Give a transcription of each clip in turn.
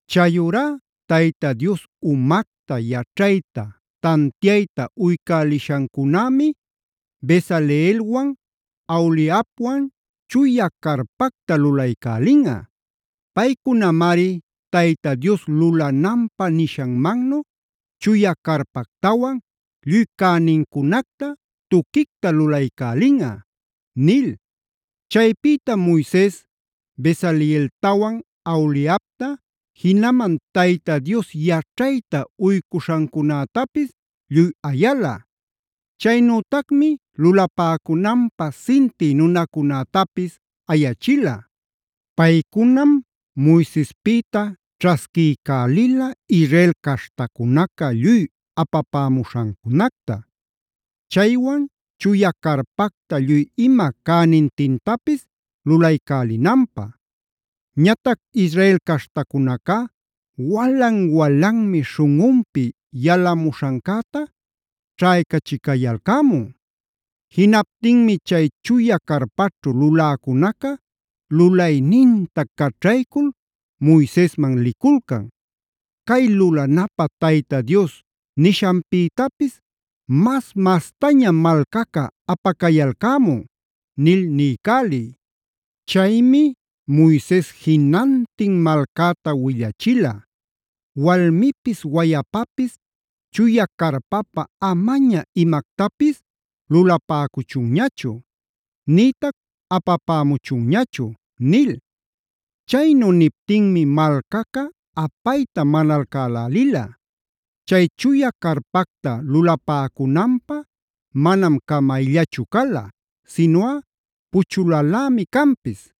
“Chayurá Tayta Dios umacta, yaćhayta, tantiayta uycäliśhancunämi Bezaleelwan Aholiabwan chuya carpactam lulaycälinꞌa. Paycunamari Tayta Dios lulananpä nishanmannu chuya carpactawan lluy cänincunacta tuquicta lulaycälinꞌa” nil. Chaypïtam Moises Bezaleeltawan Aholiabta, jinaman Tayta Dios yaćhayta uycuśhancunätapis lluy ayala. Chaynütac lulapäcunanpä sintï nunacunätapis ayachila. Paycunam Moisespïta ćhasquiycälila Israel caśhtacunaca lluy apapämuśhancunacta; chaywan chuya carpacta lluy ima cänintintapis lulaycälinanpä. Ñatac Israel caśhtacunacá walan-walanmi śhunꞌunpi yalamuśhancäta ćhaycachicayalcämun. Jinaptinmi chay chuya carpaćhu luläcunaca lulayninta caćhaycul Moisesman liculcan: “Cay lulanapä Tayta Dios nishanpïtapis mas-mastañam malcaca apacayalcämun” nil niycäliy. Chaymi Moises jinantin malcäta willachila: “Walmipis wayapapis chuya carpapä amaña imactapis lulapäcuchunñachu; nïtac apapämuchunñachu” nil. Chaynu niptinmi malcaca apayta manalcälälila. Chay chuya carpacta lulapäcunanpä manam camayllachu cala, sinuꞌa puchulalämi canpis.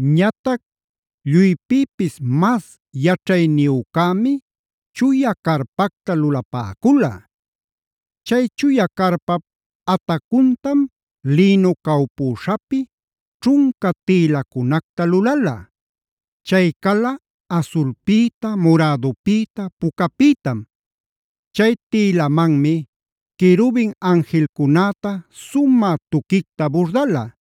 Ñatac lluypïpis mas yaćhayniyücämi chuya carpacta lulapäcula. Chay chuya carpap atacuntam lïnu cawpüśhapi ćhunca tïlacunacta lulala. Chay cala asulpïta, murädupïta, pucapïtam. Chay tïlamanmi querubin anjilcunäta sumä tuquicta burdala.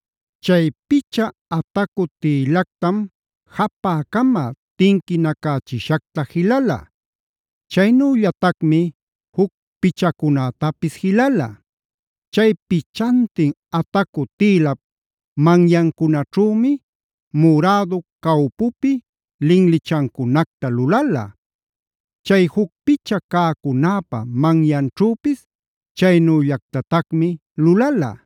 Chay picha atacu tïlactam japä-cama tinquinacächishacta jilala. Chaynüllatacmi juc pichacunätapis jilala. Chay pichantin atacu tïlap manyancunaćhümi murädu cawpupi linlichancunacta lulala. Chay juc picha cäcunäpa manyanćhüpis chaynüllactatacmi lulala.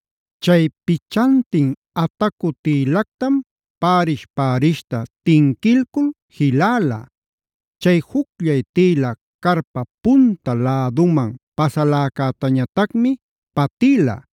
Chay pichantin atacu tïlactam pärish-pärishta tinquilcul jiläla. Chay jucllay tïla carpap punta läduman pasaläcätañatacmi patïla.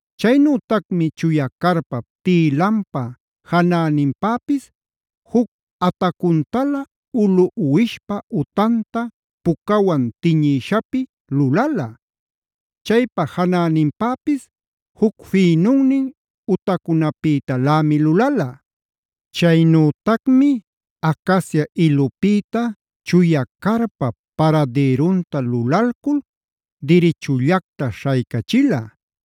Chaynütacmi chuya carpap tïlanpa janäninpäpis juc atacuntalä ulu uwishpa utanta pucawan tiñïshapi lulala. Chaypa janäninpäpis juc fïnunnin utacunapïtalämi lulala. Chaynütacmi acacia ilupïta chuya carpap paradïrunta lulalcul dirichullacta śhaycachila.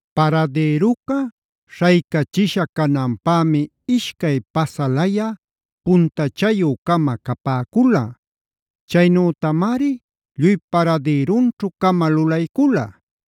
Paradïruca śhaycachisha cananpämi ishcay pasalayä puntachayü-cama capäcula. Chaynütamari lluy paradïrunćhu-cama lulaycula.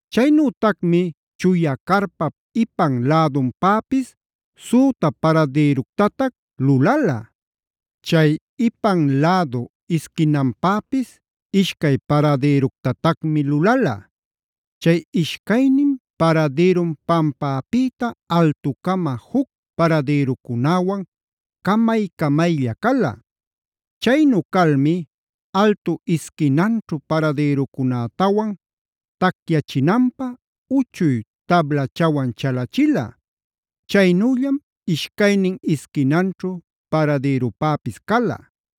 Chaynütacmi chuya carpap ipan lädunpäpis süta paradïructatac lulala. Chay ipan lädu isquinanpäpis ishcay paradïructatacmi lulala. Chay ishcaynin paradïrum pampäpïta altucama juc paradïrucunäwan camay-camaylla cala. Chaynu calmi altu isquinanćhu paradïrucunätawan tacyachinanpä uchuy tablachawan chalachila. Chaynüllam ishcaynin isquinanćhu paradïrupäpis cala.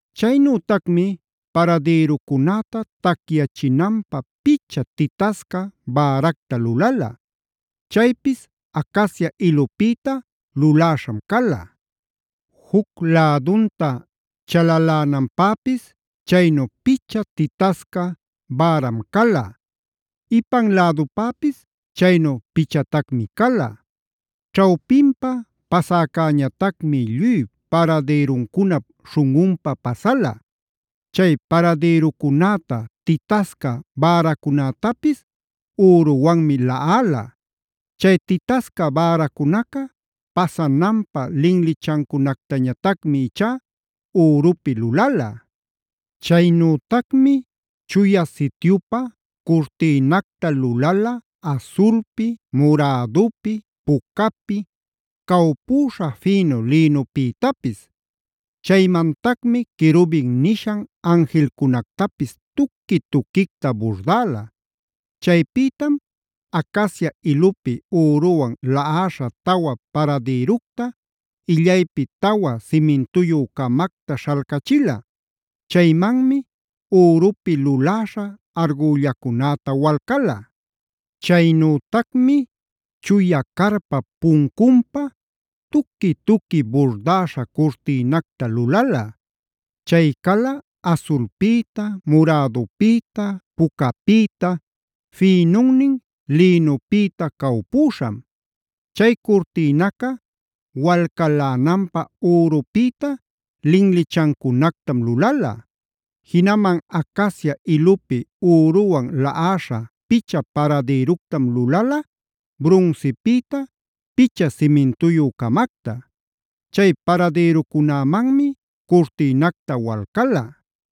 Chaynütacmi paradïrucunäta tacyachinanpä picha titasca bäracta lulala. Chaypis acacia ilupïta luläśham cala. Juc lädunta chalalänanpäpis chaynu picha titasca bäram cala. Ipan lädupäpis chaynu pichatacmi cala. Ćhawpinpa pasäcäñatacmi lluy paradïruncunap śhunꞌunpa pasala. Chay paradïrucunäta, titasca bäracunätapis üruwanmi laꞌala. Chay titasca bäracunaca pasananpä linlichancunactañatacmi ichá ürupï lulala. Chaynütacmi Chuya Sityupä curtïnacta lulala asulpi, murädupi, pucapi, cawpüśha fïnu lïnupïtapis. Chaymantacmi querubin nishan anjilcunactapis tuqui-tuquicta burdäla. Chaypïtam acacia ilupi üruwan laꞌäśha tawa paradïructa, illaypi tawa simintuyü-camacta śhalcachila. Chaymanmi ürupi luläśha argüllacunäta walcala. Chaynütacmi chuya carpap puncunpä tuqui-tuqui burdäśha curtïnacta lulala. Chay cala asulpïta, murädupïta, pucapïta, fïnunnin lïnupïta cawpüśham. Chay curtïnaca walcalänanpä ürupïta linlichancunactam lulala. Jinaman acacia ilupi üruwan laꞌäśha picha paradïructam lulala, brunsipïta picha simintuyü-camacta. Chay paradïrucunämanmi curtïnacta walcala.